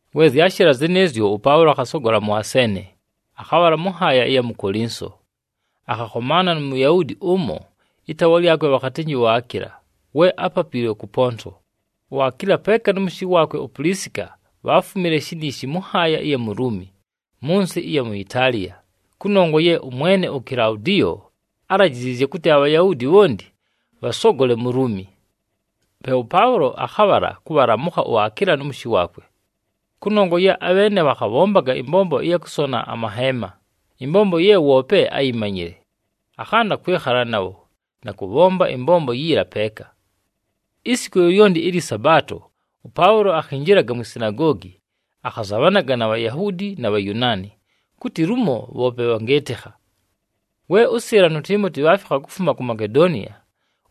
We zyashɨla zɨnɨɨzyo, ʉPaʉlo akhasogola mʉ Aseene, akhabhala mʉ nhaaya ɨya mu Kolinso. Akhakhomaana nu Muyahuudi ʉmo, ɨtaawa lyakwe bhakhatɨnjɨ uAkiila, we ápapiilwe kʉ Ponto. UAkiila peeka nʉ mʉshɨ waakwe uPulisika bhaafumile shiniishi mʉ nhaaya ɨya mu Luumi mʉ nsɨ ɨya mu Itaaliya kʉnongwa ye ʉmwene uKilaudiyo álajiziizye kʉtɨ aBhayahuudi bhonti bhasogole mu Luumi. Pe ʉPaʉlo akhabhala kʉbhalamʉkha uAkiila nʉ mʉshɨ waakwe. Kʉnongwa ye abheene bhakhabhombaga ɨmbombo ɨya kʉsona amaheema, ɨmbombo ye woope áyimanyile, akhanda kwɨkhala nabho, na kʉbhomba ɨmbombo yiila peeka. Isiku lyolyonti ɨlyɨ Sabaato, ʉPaʉlo akhinjilaga mwi sinagoogi, akhazabhanaga na Bhayahuudi na Bhayunaani, kʉtɨ lumo bhoope bhangɨɨtɨkha. We ʉSɨɨla nu Tiimoti bhaafikha kufuma ku Makedoniya,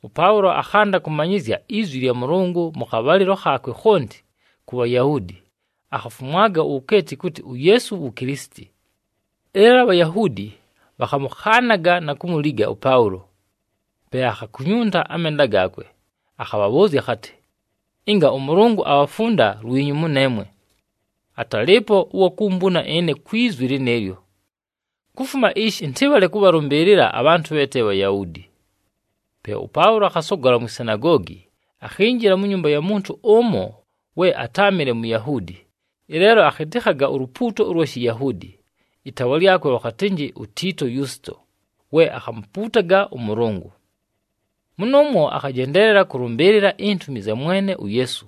ʉPaʉlo akhanda kʉmanyɨzya izwi lya Mʉlʉngʉ mʉ khabhalɨlo khaakwe khonti ku Bhayahuudi, akhafumwaga uwukeeti kʉtɨ uYeesu wu Kilisiti. Ɨleelo aBhayahuudi bhakhamʉkhaanaga na kumuliga ʉPaʉlo. Pe akhakunyunta amenda gaakwe, akhabhabhʉʉzya akhatɨ, “Ɨnga ʉMʉlʉngʉ abhafunda lwinyu mʉneemwe! Atalɨɨpo ʉwa kumbuna ɨne kwi zwi lɨnɨɨlyo. Kufuma ishi, ɨntɨbhale kʉbhalʉmbɨɨlɨla abhantʉ bhe te Bhayahuudi.” Pe ʉPaʉlo akhasogola mwi sinagoogi, akhinjila mu nyumba ya muntu ʉmo we atáamɨle Muyahuudi, ɨleelo akhɨtɨkhaga ulupuuto ʉlwa Shiyahuudi, ɨtaawa lyakwe bhakhatɨnjɨ uTiito Yusito, we akhamupuutaga ʉMʉlʉngʉ. Mʉnʉʉmwo akhajendeelela kʉlʉmbɨɨlɨla intumi zya Mwene uYeesu.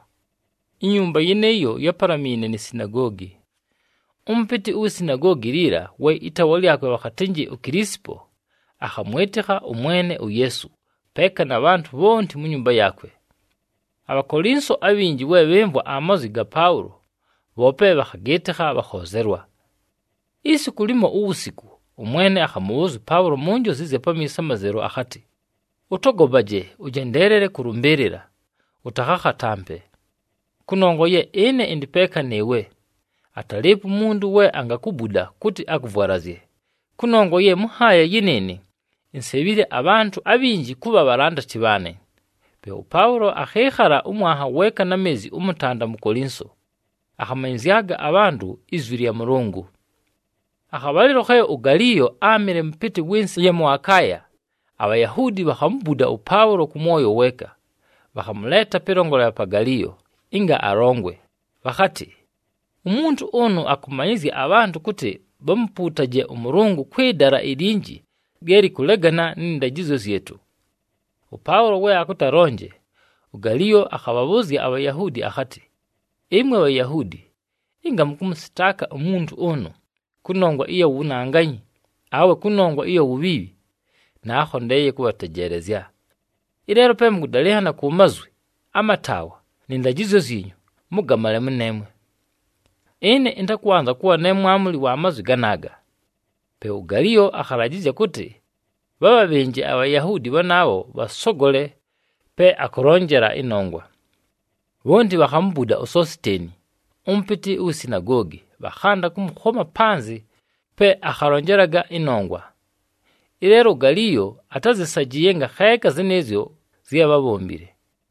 Inyumba yɨnɨɨyo yápalamiine ni sinagoogi. Ʉmʉpɨtɨ uwi sinagoogi liila, we ɨtaawa lyakwe bhakhatɨnjɨ uKilisipo, akhamwɨtɨkha ʉMwene uYeesu, peeka na bhantʉ bhonti mu nyumba yaakwe. ABhakolinso abhinji we bhɨmvwa amazwi ga Paʉlo, bhoope bhakhagɨɨtɨkha, bhakhoozelwa. Isiku limo uwusiku, ʉMwene akhamʉbhʉʉzya ʉPaʉlo mu njozi ɨzya pamiiso amazelu akhatɨ, “Ʉtogopaje, ʉjendeelele kʉlʉmbɨɨlɨla, ʉtakhakhatampe, kʉnongwa ye ɨne ɨndɨ peeka nɨɨwe. Atalɨɨpo umuntu we angakubuda kʉtɨ akʉvwalazye, kʉnongwa ye mʉ nhaaya yɨnɨɨnɨ insebhile abhantʉ abhinji kʉbha bhalandati bhaanɨ.” Pe ʉPaʉlo akhɨɨkhala ʉmwanha weeka na meezi ʉmʉtanda mu Kolinso, akhamanyɨzyaga abhantʉ izwi lya Mʉlʉngʉ. Akhabhalɨlo khe uGaliyo áamɨle mʉpɨtɨ wɨ nsɨ ɨya mʉ Akaaya, aBhayahuudi bhakhamubuda ʉPaʉlo kʉ mwoyo weeka. Bhakhamʉleeta pɨlongolela pa Galiyo ɨnga alongwe, bhakhatɨ, “Umuntu ʉnʉ akʉbhamanyɨzya abhantʉ kʉtɨ bhamupuutaje ʉMʉlʉngʉ kwɨ dala ilinji lye lɨkʉlegana nɨ ndajɨzyo zyɨtʉ.” ɄPaʉlo we akʉtɨ alonje, uGaliyo akhabhabhʉʉzya aBhayahuudi akhatɨ, “Ɨmwe Bhayahuudi ɨnga mʉkʉmʉsɨtaaka umuntu ʉnʉ kʉnongwa ɨya wunanganyi, awe kʉnongwa ɨya wubhiibhi, naakhondeeye kʉbhatejeelezya. Ɨleelo pe mʉkʉdalɨnhana ku mazwi, amataawa, nɨ ndajɨzyo zyinyu, mʉgamale mʉneemwe. Ɨne ɨntakwanza kʉbha ne mwamuli wa mazwi ganaaga.” Pe uGaliyo akhalajɨzya kʉtɨ bhabhabhɨnje aBhayahuudi bhanaabho bhasogole pe akʉlonjela ɨnongwa. Bhonti bhakhamubuda uSositeeni, ʉmʉpɨtɨ uwi sinagoogi, bhakhanda kʉmʉkhoma panzɨ pe akhalonjelaga ɨnongwa. Ɨleelo uGaliyo atázɨsajɨɨye ngakheeka zɨnɨɨzyo zye bhábhombile.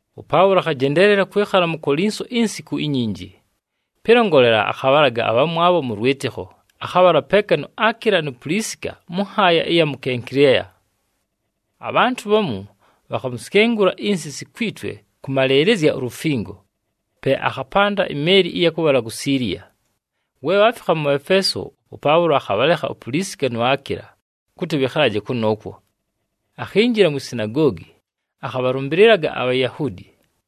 ɄPaʉlo akhajendeelela kwɨkhala mu Kolinso insiku inyinji. Pɨlongolela, akhabhalaga abhamwabho mʉ lwɨtɨkho, akhabhala peeka nu Akiila nu Pulisika mʉ nhaaya ɨya mu Kenkileya. Abhantʉ bhamu bhakhamusyengula insisi kwi twe kʉmalɨɨlɨzya ulufingo, pe akhapanda imeeli ɨya kʉbhala ku Siiliya. We bhaafikha mʉ Efeeso, ʉPaʉlo akhabhalekha uPulisika nu Akiila kʉtɨ bhɨkhalaje kʉnʉʉkwo. Akhinjila mwi sinagoogi, akhabhalʉmbɨlɨlaga aBhayahuudi.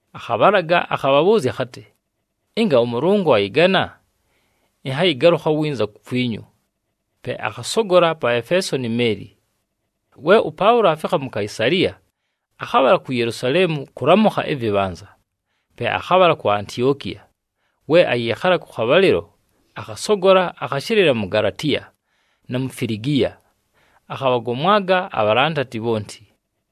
Akhabhalaga akhabhabhʉʉzya akhatɨ, “Ɨnga ʉMʉlʉngʉ ayɨgana, ɨnhayɨgalʉkha winza kukwinyu.” Pe akhasogola pa Efeeso ni meeli. We ʉPaʉlo aafikha mu Kaisaliya, akhabhala ku Yelusaleemu kʉlamʉkha ɨvɨbhanza, pe akhabhala ku Antiokiya. We ayɨɨkhala kʉ khabhalɨlo, akhasogola, akhashɨlɨla mu Galatiya, na mu Filigiya, akhabhagomwaga abhalandati bhonti.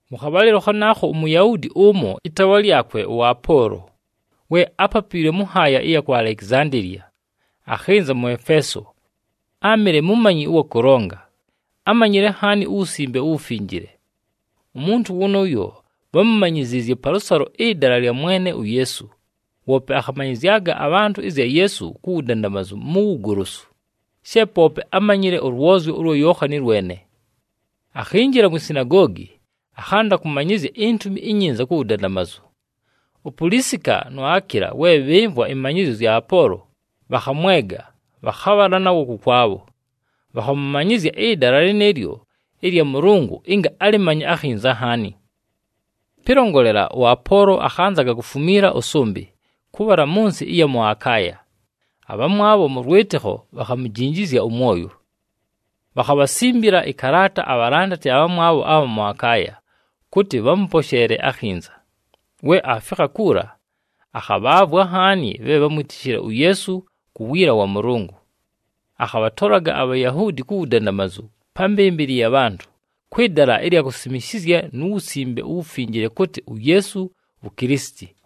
Mʉ khabhalɨlo khanaakho, uMuyahuudi ʉmo, ɨtaawa lyakwe ʉApoolo, we ápapiilwe mʉ nhaaya ɨya ku Alekizandeeliya, akhɨnza mʉ Efeeso. Áamɨle mumanyi ʉwa kʉlonga, ámanyile nhaani uWusimbe uWufinjile. Umuntu wʉnʉʉyo bhámumanyiziizye palʉsalo ɨdala lya Mwene uYeesu, woope akhamanyɨzyaga abhantʉ ɨzya Yeesu ku wudandamazu mu wugolosu, she poope ámanyile ʉlwozyo ʉlwa Yookhani lwene. Akhinjila mwi sinagoogi, akhanda kʉmanyɨzya iNtumi iNyinza ku wudandamazu. UPulisika nu Akiila, we bhɨmvwa ɨmanyɨzyo zya Apoolo, bhakhamwega, bhakhabhala nawo kʉkwabho, bhakhamʉmanyɨzya ɨdala lɨnɨɨlyo ɨlya Mʉlʉngʉ ɨnga alɨmanye akhinza nhaani. Pɨlongolela, ʉApoolo akhanzaga kufumiila ʉsʉmbɨ kʉbhala mʉ nsɨ ɨya mʉ Akaaya, abhamwabho mʉ lwɨtɨkho bhakhamujinjizya ʉmwoyo. Bhakhabhasimbila ɨkalaata abhalandati abhamwabho abha mʉ Akaaya kʉtɨ bhamʉposheele akhinza. We aafikha kuula, akhabhaavwa nhaani bhe bhámwitishile uYeesu ku wiila wa Mʉlʉngʉ. Akhabhatolaga aBhayahuudi ku wudandamazu pa mbɨmbɨlɨ ya bhantʉ, kwɨ dala ɨlya kubhasimishizya nu Wusimbe uWufinjile kʉtɨ uYeesu wu Kilisiti.